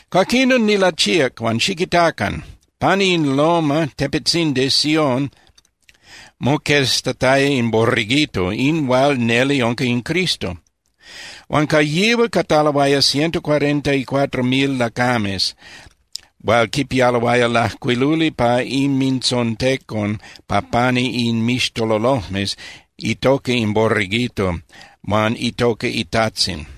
Cuaquinon nilachíac huan ¡xiquitacan! Pani in loma (tepetzindi) Sión moqueztataya in Borreguito, in hual neli unca in Cristo. Huan ca yihual cataloaya ciento cuarenta y cuatro mil lacames hual quipialoaya lajcuiluli pa inmintzontecon pa pani inmixtololojmes itoca in Borreguito huan itoca iTajtzin.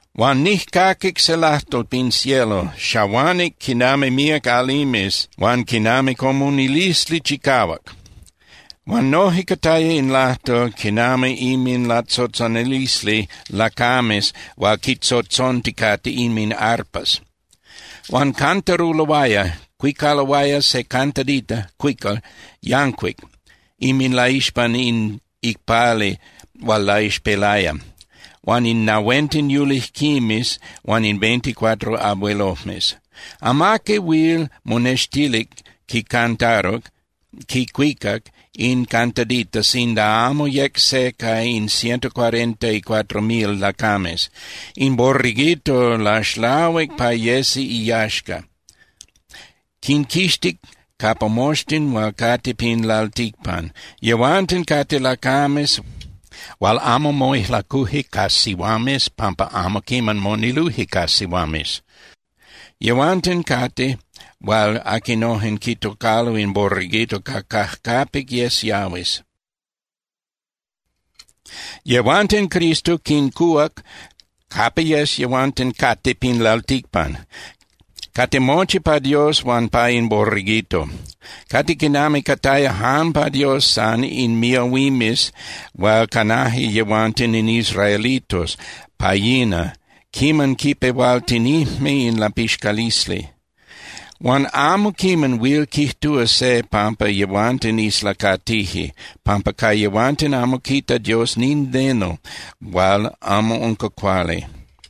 Huan nijcaquic se lajtol pin cielo, xahuanic quinami míac alimes huan quinami comunilisli chicahuac. Huan noje cataya in lajtol quinami inminlatzotzonalisli lacames hual quintzotzonticate inminarpas. Huan cantaruloaya (cuicaloaya) se cantadita (cuical) yancuic inminlaixpan in icpali hual laixpelaya huan in nahuenten yulijquimes huan in veinticuatro abuelojmes. Amaqui huil monextilic quicantaruc (quicuicac) in cantadita sinda amo yec se ca in ciento cuarenta y cuatro mil lacames. In Borreguito laxlahuic pa yesi iyaxca, quinquixtic capa moxtin hual cate pin lalticpan. Yehuanten cate lacames hual amo moijlacuje ca sihuames pampa amo quiman moniluje ca sihuames. Yehuanten cate hual aquinojen quitocalo in Borreguito ca cajcapic yes yahuis. Yehuanten Cristo quincuhuac capa yes yehuanten cate pin lalticpan. Cate mochi pa Dios huan pa in Borreguito. Cate quinami cataya jan pa Dios san in miahuimes hual canaje yehuanten in israelitos pa yina quiman quipehualtinijme in lapixcalisli. Huan amo quiman huil quijtúa se pampa yehuanten islacatije pampa ca yehuanten amo quita Dios nindeno hual amo unca cuali.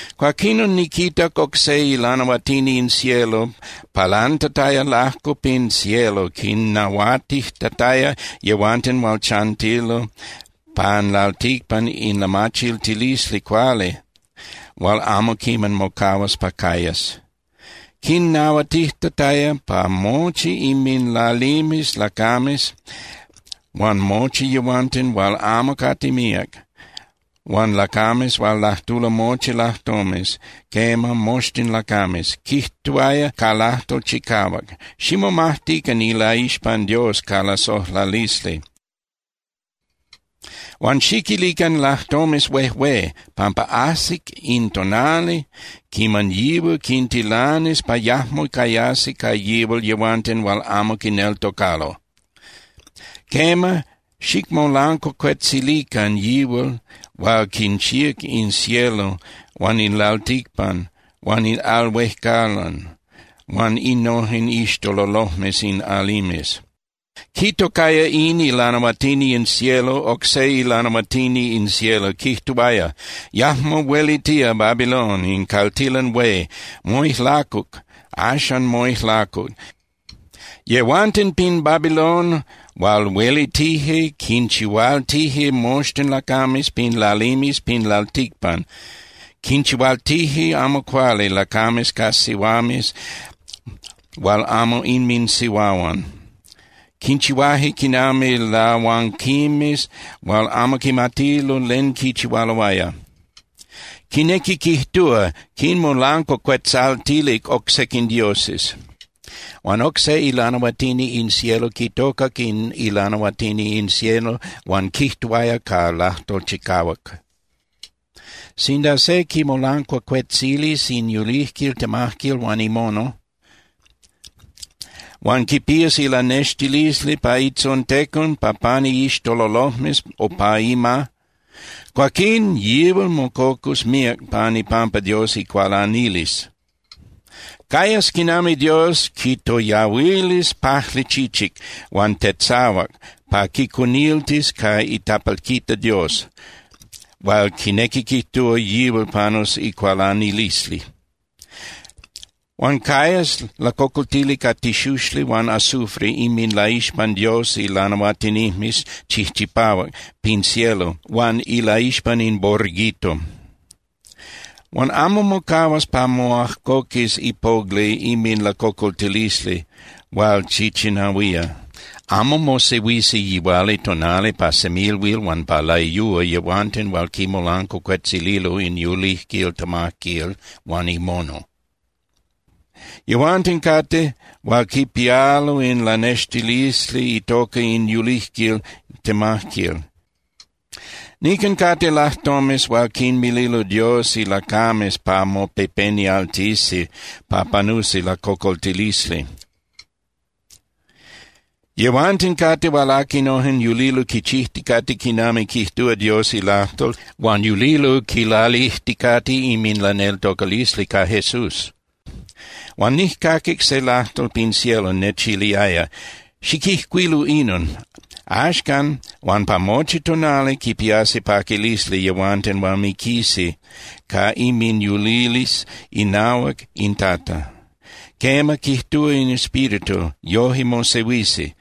Cuaquinon niquitac oc se ilanahuatini in cielo palantataya lajco pin cielo quinnahuatijtataya yehuanten hual chantilo pan lalticpan in lamachiltilisli cuali hual amo quiman mocahuas pa cayas. Quinnahuatijtataya pa mochi inminlalimes lacames huan mochi yehuanten hual amo cate míac, huan lacames hual lajtulo mochi lajtomes, quema, moxtin lacames. Quijtuaya ca lajtol chicahuac: —Ximomajtican ilaixpan Dios ca lasojlalisli, huan xiquilican lajtomes huejué, pampa ajsic in tonali quiman yihual quintilanis pa yajmo cayasi ca yihual yehuanten hual amo quineltocalo. Quema, xicmolancuacuetzilican yihual hual quinchíac in cielo huan in lalticpan huan in al huejcalan huan innojen iixtololojmes in alimes. Quitocaya in ilanahuatini in cielo oc se ilanahuatini in cielo, quijtuaya: —Yajmo huelitía Babilon, in caltilan hué. Moijlacuc, axan moijlacuc. Yehuanten pin Babilón hual huelitije quinchihualtije moxtin lacames pin lalimes pin lalticpan, quinchihualtije amo cuali lacames ca sihuames hual amo inminsihuahuan, quinchihuaje quinami lahuanquimes hual amo quimatije len quichihualoaya, quinequi quijtúa, quinmolancuacuetzaltilic oc sequin dioses. Huan oc se ilanahuatini in cielo quitocac in ilanahuatini in cielo huan quijtuaya ca lajtol chicahuac: —Sinda se quimolancuacuetzilis in yulijquil temajquil huan imono, huan quipías ilanextilisli pa itzontecon pa pani iixtololojmes o pa ima, cuaquín yihual mococus míac pan ipampa Dios icualanilisli. Cayas quinami Dios quitoyahuilis pajli chichic huan tetzahuac pa quicuniltis ca itapalquita Dios, hual quinequi quijtúa yihual panus icualanilisli. Huan cayas lacocoltili ca tixuxli huan azufre inminlaixpan Dios ilanahuatinijmes chijchipahuac pin cielo huan ilaixpan in Borreguito. Huan amo mocahuas pa moajcoquis ipogli inminlacocoltilisli hual chichinahuía. Amo mosehuisi yihualitonali pa semilhuil huan pa layúa yehuanten hual quimolancuacuetzililo in yulijquil temajquil huan imono. Yehuanten cate hual quipialo in ilanextilisli itoca in yulijquil temajquil. Nican cate lajtomes hual quinmililo Dios ilacames pa mopepenialtisi pa panusi lacocoltilisli. Yehuanten cate hual aquinojen yulilo quichijticate quinami quijtúa Dios ilajtol huan yulilo quilalijticate inminlaneltocalisli ca Jesús. Huan nijcaquic se lajtol pin cielo nechiliaya: —Xiquijcuilu inon: “Axcan huan pa mochi tonali quipiasi paquilisli yehuanten hual miquisi ca inminyulilisli inahuac in Tata.” Quema, quijtúa in Espíritu, yoje mosehuisi,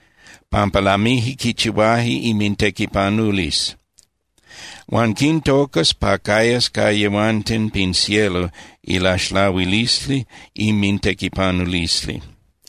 pampa lamije quichihuaje inmintequipanulisli. Huan quintocas pa cayas ca yehuanten pin cielo ilaxlahuilisli inmintequipanulisli.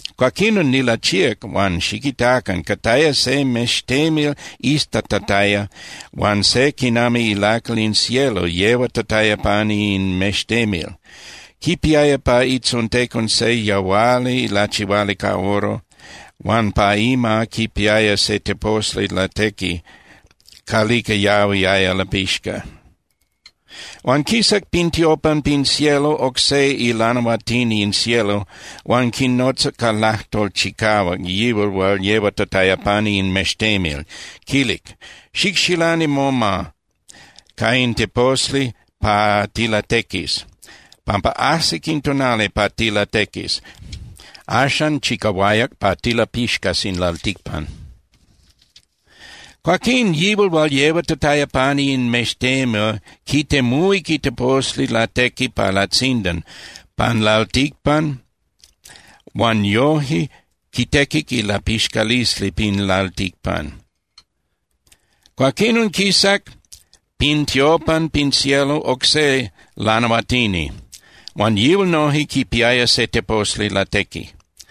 Cuaquinon nilachíac huan ¡xiquitacan! Cataya se mextemil iztatataya huan se quinami ilacal in cielo yehuatataya pani in mextemil, quipiaya pa itzontecon se yahuali lachihuali ca oro huan pa ima quipiaya se teposli latequi calica yahuiaya lapixca. Huan quisac pin tiopan pin cielo oc se ilanahuatini in cielo huan quinotzac ca lajtol chicahuac yihual hual yehuatataya pani in mextemil, quilic: —Xicxilani moma ca in teposli pa tilatequis, pampa ajsic in tonali pa tilatequis. Axan chicahuayac pa tilapixcas in lalticpan. Cuaquín yihual hual yehuatataya pani in mextemil quitemuhuic iteposli latequi pa latzindan pan lalticpan huan yoje quitequic ilapixcalisli pin lalticpan. Cuaquinon quisac pin tiopan pin cielo oc se lanahuatini huan yihual noje quipiaya se teposli latequi.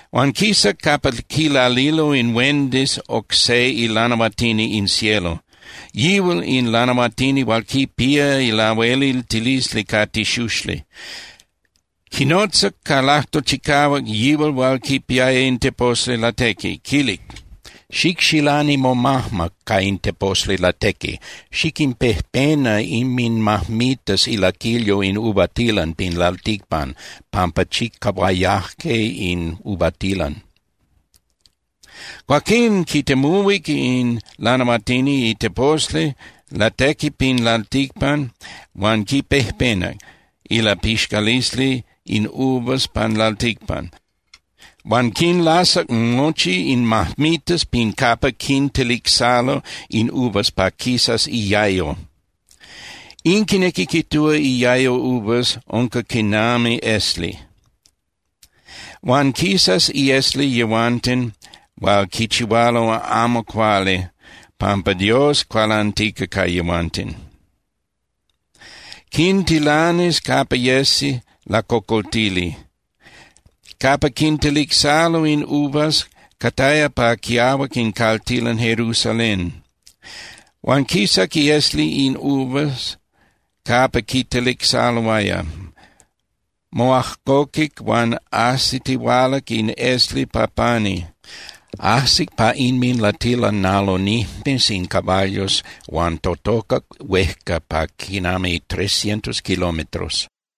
Huan quisac capa quilalilo in huendis oc se ilanahuatini in cielo, yihual in lanahuatini hual quipía lahueliltilisli ca tixuxli. Quinotzac ca lajtol chicahuac yihual hual quipiaya in teposli latequi, quilic: —Xicxilani momajma ca in teposli latequi, xiquinpejpena inminmajmitas ilaquilyo in uvatilan pin lalticpan, pampa chicahuayaje in uvatilan. Cuaquín quitemuhuic in lanahuatini iteposli latequi pin lalticpan huan quipejpenac ilapixcalisli in uvas pan lalticpan, huan quinlasac mochi in majmitas pin capa quintelicsalo in uvas pa quisas iayo. In quinequi quijtúa iayo uvas unca quinami esli. Huan quisas iesli yehuanten hual quichihualo amo cuali pampa Dios cualantica ca yehuanten. Quintilanis capa yesi lacocoltili. Capa quintelicsalo in uvas cataya pa quiahuac in caltilan Jerusalén. Huan quisac iesli in uvas capa quitelicsaloaya. Moajcoquic huan ajsitihualac in esli pa pani, ajsic pa inminlatilanalonijmes in caballos huan totocac huejca pa quinami trescientos kilómetros.